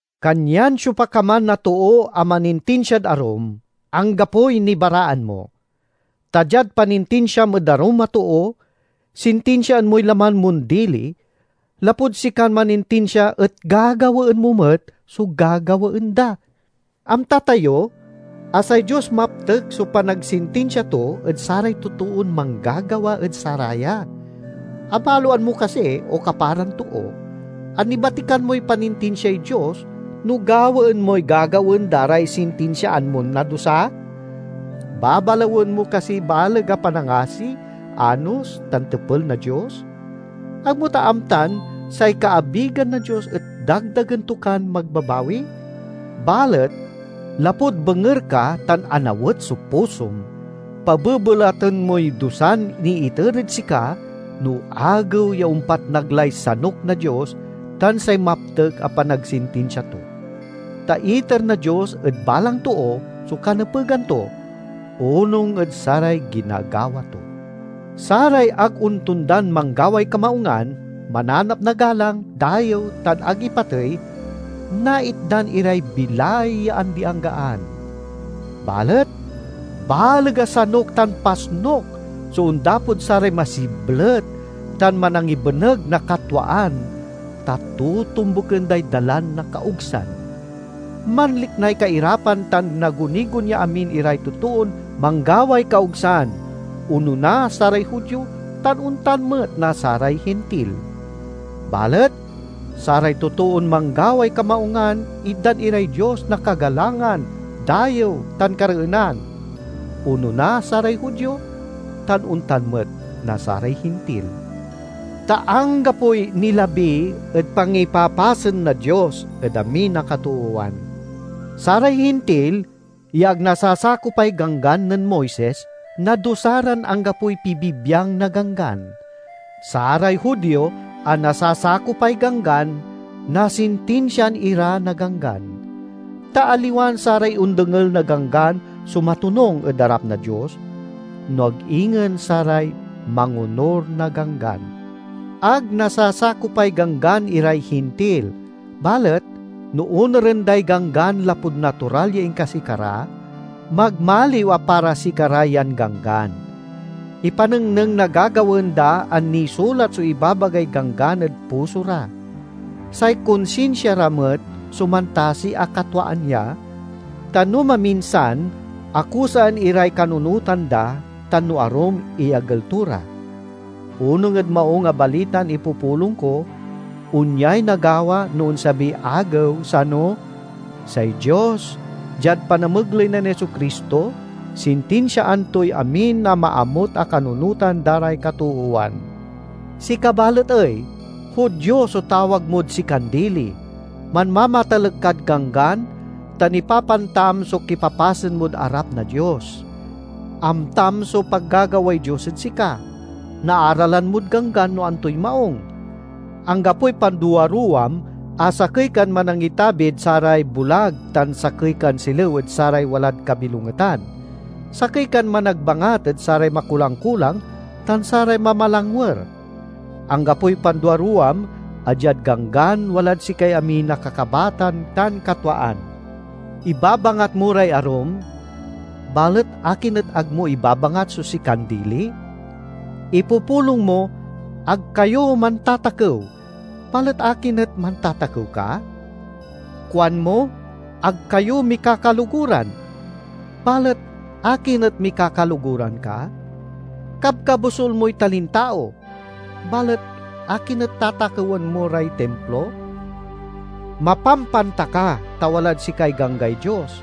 Kanyan siopa ka man a too a manintinsiad arum, anggapoy nibaraan mo. Ta diad panintinsiam ed arum a too, sintinsiaan moy laman mon dili, lapud sikan manintinsia et gagawaen mo met so gagawaen da. Amta tayo a say Dios maptek so panagsintinsia to ed saray totoon manggagawa ed saraya. Abaloan mo kasi, o kaparan too, a nibatikan moy panintinsiay Dios no gawaen moy gagawaen da ray sintinsiaan mon nadusa? Babalawen mo kasiy baleg a panangasi, anos, tan tepel na Dios? Ag mo ta amtan say kaabigan na Dios et dagdagen to kan magbabawi? Balet lapud benger ka tan anawet so pusom, pabebelaten moy dusan niiter ed sika no Agew ya ompatnag lay sanuk na Dios tan say maptek a panagsintinsia to. Ta iter na Dios ed balang too so kanepegan to, onung ed saray ginagawa to. Saray ag ontondan manggaway kamaungan, mananap na galang, dayew, tan ag ipatey, naitdan iray bilay ya andi-anggaan. Balet baleg a sanuk tan pasnuk so ondapod saray masiblet tan manangibeneg na katwaan, ta totombuken day dalan na kaogsan. Manliknay kairapan tan nagunigon ya amin iray totoon manggaway kaogsan, onona, saray Judio tan ontan met na saray Hintil. Balet saray totoon manggaway kamaungan itdan iray Dios na kagalangan, dayew, tan kareenan, onona, saray Judio tan ontan met na saray Hintil. Ta anggapoy nilabi ed pangipapasen na Dios ed amin a katoowan. Saray Hintil ya ag nasasakopay Ganggan nen Moises nadusa ran anggapoy pibibiang na Ganggan. Saray Judio a nasasakopay Ganggan nasintinsiaan ira na Ganggan. Ta aliwan saray ondengel na Ganggan so matonung ed arap na Dios, no ag ingen saray mangonur na Ganggan. Ag nasasakopay Ganggan iray Hintil, balet no onuren day Ganggan lapud natural ya inkasikara, magmaliw a para sikara yan ganggan. Ipanengneng na gagawaen da a nisulat so ibabagay Ganggan ed puso ra. Say konsinsia ra met so mantasi a katwaan ya, ta no maminsan akusaen iray kanunotan da, tan no arum iyagel to ra. Onung ed Maung a Balitan ipupulong ko, onyay nagawa no onsabiy Agew sano: say Dios, diad panamegley nen Jesu-Cristo, sintinsiaan toy amin a maamut a kanunotan da ray katoowan. Sika balet ey? Judio so tawag mod sikan dili; manmamatalek kad Ganggan tan ipapantam so kipapasen mod arap na Dios. Amtam so pagagaway Dios ed sika; naaralan mod Ganggan no antoy maung; anggapoy panduaruwam a sakey kan manangitabid saray bulag tan sakey kan silew ed saray walad kabilongetan; sakey kan managbangat ed saray makulang-kulang tan saray mamalangwer. Anggapoy panduaruwam a diad Ganggan walad sikay amin a kakabatan tan katwaan. Ibabangat mo ray arum, balet akin et ag mo ibabangat so sikan dili? Ipupulong mo, "Ag kayo mantatakew," balet akin et mantatakew ka? Kuanmo, "Ag kayo mikakaloguran," balet akin et mikakaloguran ka? Kabkabosul moy talintao, balet akin et tatakewan mo ray Timplo? Mapampanta ka, ta walad sikay Ganggay Dios,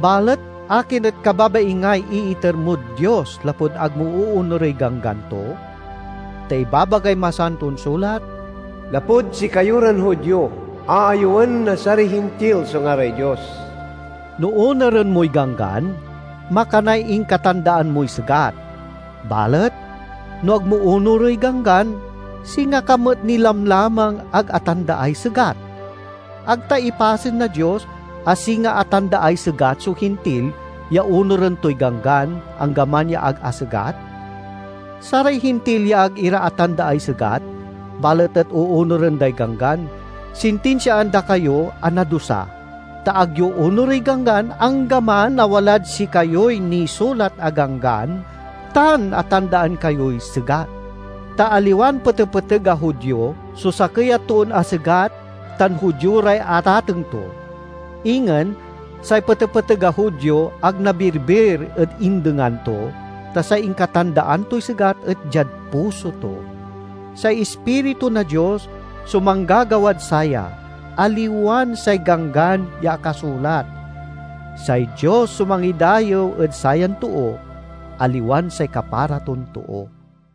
balet akin et kababaingay iiter mod Dios lapud ag mo oonurey ganggan to? Ta ibabagay Masanton Sulat, "Lapud sikayo ran Judio, aayewen na saray Hintil so ngaray Dios." No onuren moy Ganggan, makanay inkatandaan moy segat. Balet no ag mo onurey Ganggan, singa ka met ni lamlamang ag atandaay segat. Ag ta ipasen na Dios a singa atandaay segat so Hintil ya onuren toy Ganggan, anggaman ya ag asegat? Saray Hintil ya ag ira atandaay segat balet et oonuren day Ganggan sintinsiaan da kayo a nadusa, ta ag yo onurey Ganggan, anggaman a walad sikayoy nisulat a Ganggan tan atandaan kayoy segat. Ta aliwan petepeteg a Judio so sakey a toon asegat tan Judio ray atateng to. Ingen, say petepeteg a Judio ag nabirbir ed indengan to, ta say inkatandaan toy segat et diad puso to. Say Ispiritu na Dios so manggagawad saya, aliwan say Ganggan ya akasulat. Say Dios so mangidayew ed sayan too, aliwan say kapara ton too.